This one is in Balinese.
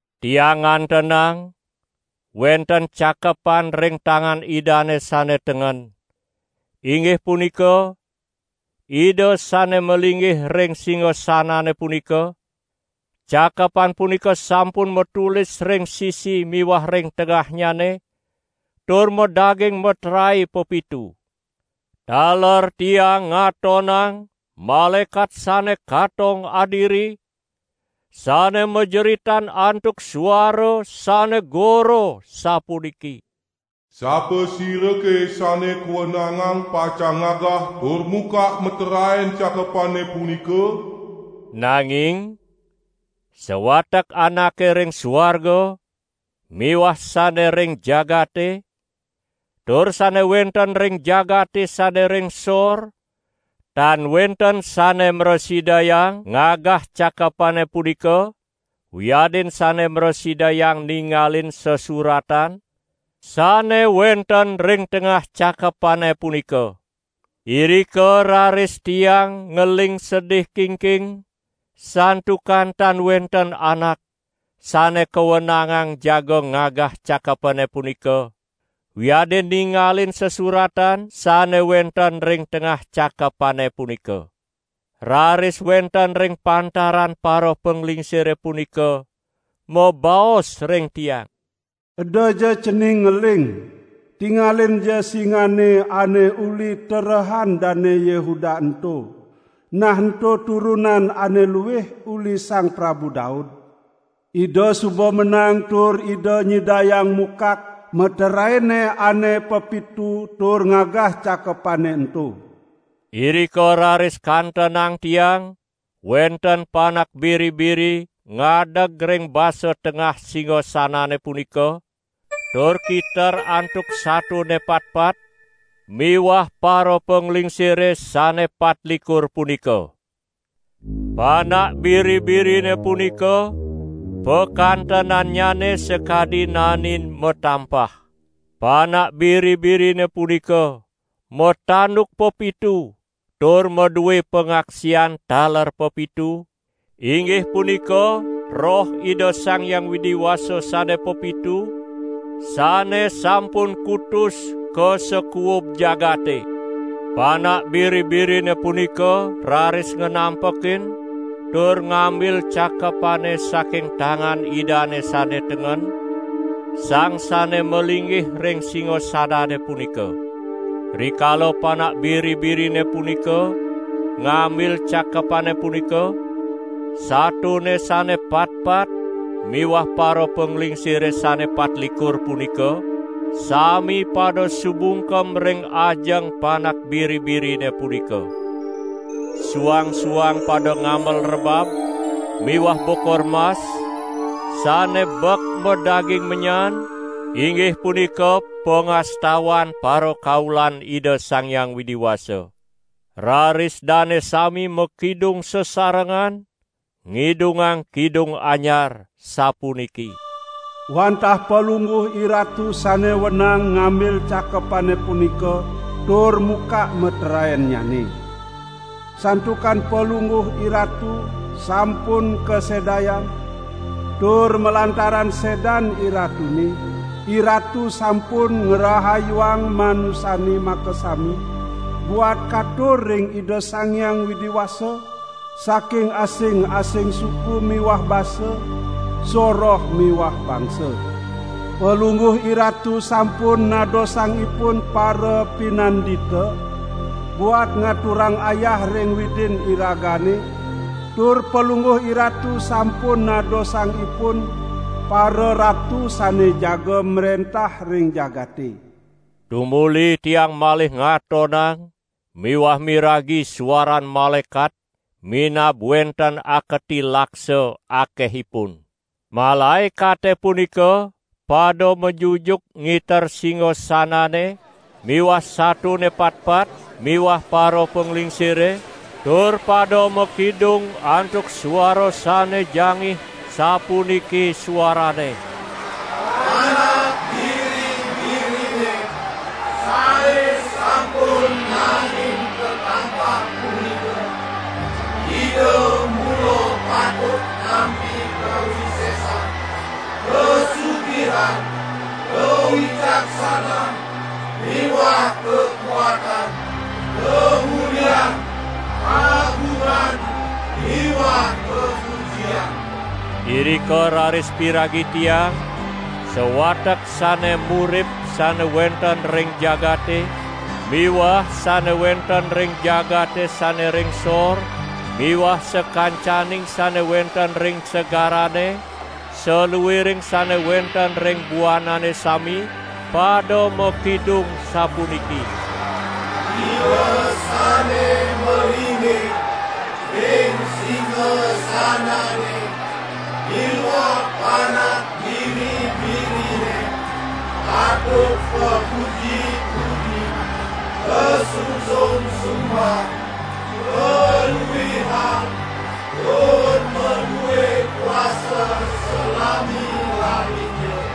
Tiang ngantenang wenten cakepan ring tangan Idane sane tengen, inggih punika, Ida sane malinggih ring singasanane punika; cakepan punika sampun matulis ring sisi miwah ring tengahnyane tur madaging meterae pepitu. Taler tiang ngatonang malaekat sane katong adiri sane majeritan antuk suara sane gora sapuniki: "Sapasirake sane kawenangang pacang ngagah tur mukak meteraen cakepane punika?" Nanging sawatek anake ring suarga miwah sane ring jagate tur sane wenten ring jagate sane ring sor, tan wenten sane mrasidayang ngagah cakepane punika wiadin sane mrasidayang ningalin sesuratan sane wenten ring tengah cakepane punika. Irika raris tiang ngeling sedih kingking, santukan tan wenten anak sane kawenangang jaga ngagah cakepane punika wiadin ningalin sesuratan sane wenten ring tengah cakepane punika. Raris wenten ring pantaran parapanglingsire punika mabaos ring tiang: "Edaja cening ngeling! Tingalinja singane ane uli terehan Dane Yehuda ento, nah ento turunan ane luih uli Sang Prabu Daud, Ida suba menang tur Ida nyidayang mukak meteraene ane pepitu tur ngagah cakepane ento." Irika raris kantenang tiang wenten Panak Biri-biri ngadeg ring basa tengah singasanane punika, tur kiter antuk satone patpat miwah parapanglingsire sane patlikur punika. Panak Biri-birine punika pakantenannyane sakadi naenin matampah. Panak Biri-birine punika matanduk pepitu tur madue pangaksian taler pepitu, inggih punika Roh Ida Sang Hyang Widi Wasa sane pepitu, sane sampun kutus ka sakuub jagate. Panak Biri-birine punika raris nganampekin tur ngambil cakepane saking tangan Idane sane tengen, sang sane malinggih ring singasanane punika. Rikala Panak Biri-birine punika ngambil cakepane punika, satone sane patpat miwah parapanglingsire sane patlikur punika, sami pada sumungkem ring ajeng Panak Biri-birine punika. Suang-suang pada ngamel rebab miwah bokor mas, sane bek madaging menyan, inggih punika pangastawan parakaulan Ida Sang Hyang Widi Wasa. Raris dane sami makidung sasarengan ngidungang kidung anyar sapuniki: "Wantah Palungguh IRatu sane wenang ngambil cakepane punika tur mukak meteraennyane. Santukan Palungguh IRatu sampun kasedayang, tur malantaran sedan IRatune, IRatu sampun ngrahayuang manusane makasami buat katur ring Ida Sang Hyang Widi Wasa, saking asing-asing suku miwah basa, soroh miwah bangsa. Palungguh IRatu sampun nadosang ipun parapinandita, buat ngaturang ayah ring Widin iragane, tur Palungguh IRatu sampun nadosang ipun pararatu sane jaga mrentah ring jagate." Tumuli tiang malih ngatonang miwah miragi suaran malaekat minab wenten aketi laksa akehipun. Malaekate punika pada majujuk ngiter singasanane miwah satone patpat miwah parapanglingsire, tur pada makidung antuk suara sane jangih sapuniki suaranne: "Panak Biri-birine sane sampun naenin katampah punika, Ida mula patut nampi kawisesan, kasugihan, kawicaksanan miwah kakuatan, kamulian, kagungan miwah kapujian." Irika raris piragi tiang sawatek sane murip sane wenten ring jagate miwah sane wenten ring jagate sane ring sor miwah sakancaning sane wenten ring segarane, saluiring sane wenten ring buanane sami, pada makidung sapuniki: "Ida sane malinggih ring singasanane miwah Panak Biri-birine, patut kapuji-puji, kasungsung sumbah, kaluihang tur madue kuasa salami-laminnya!"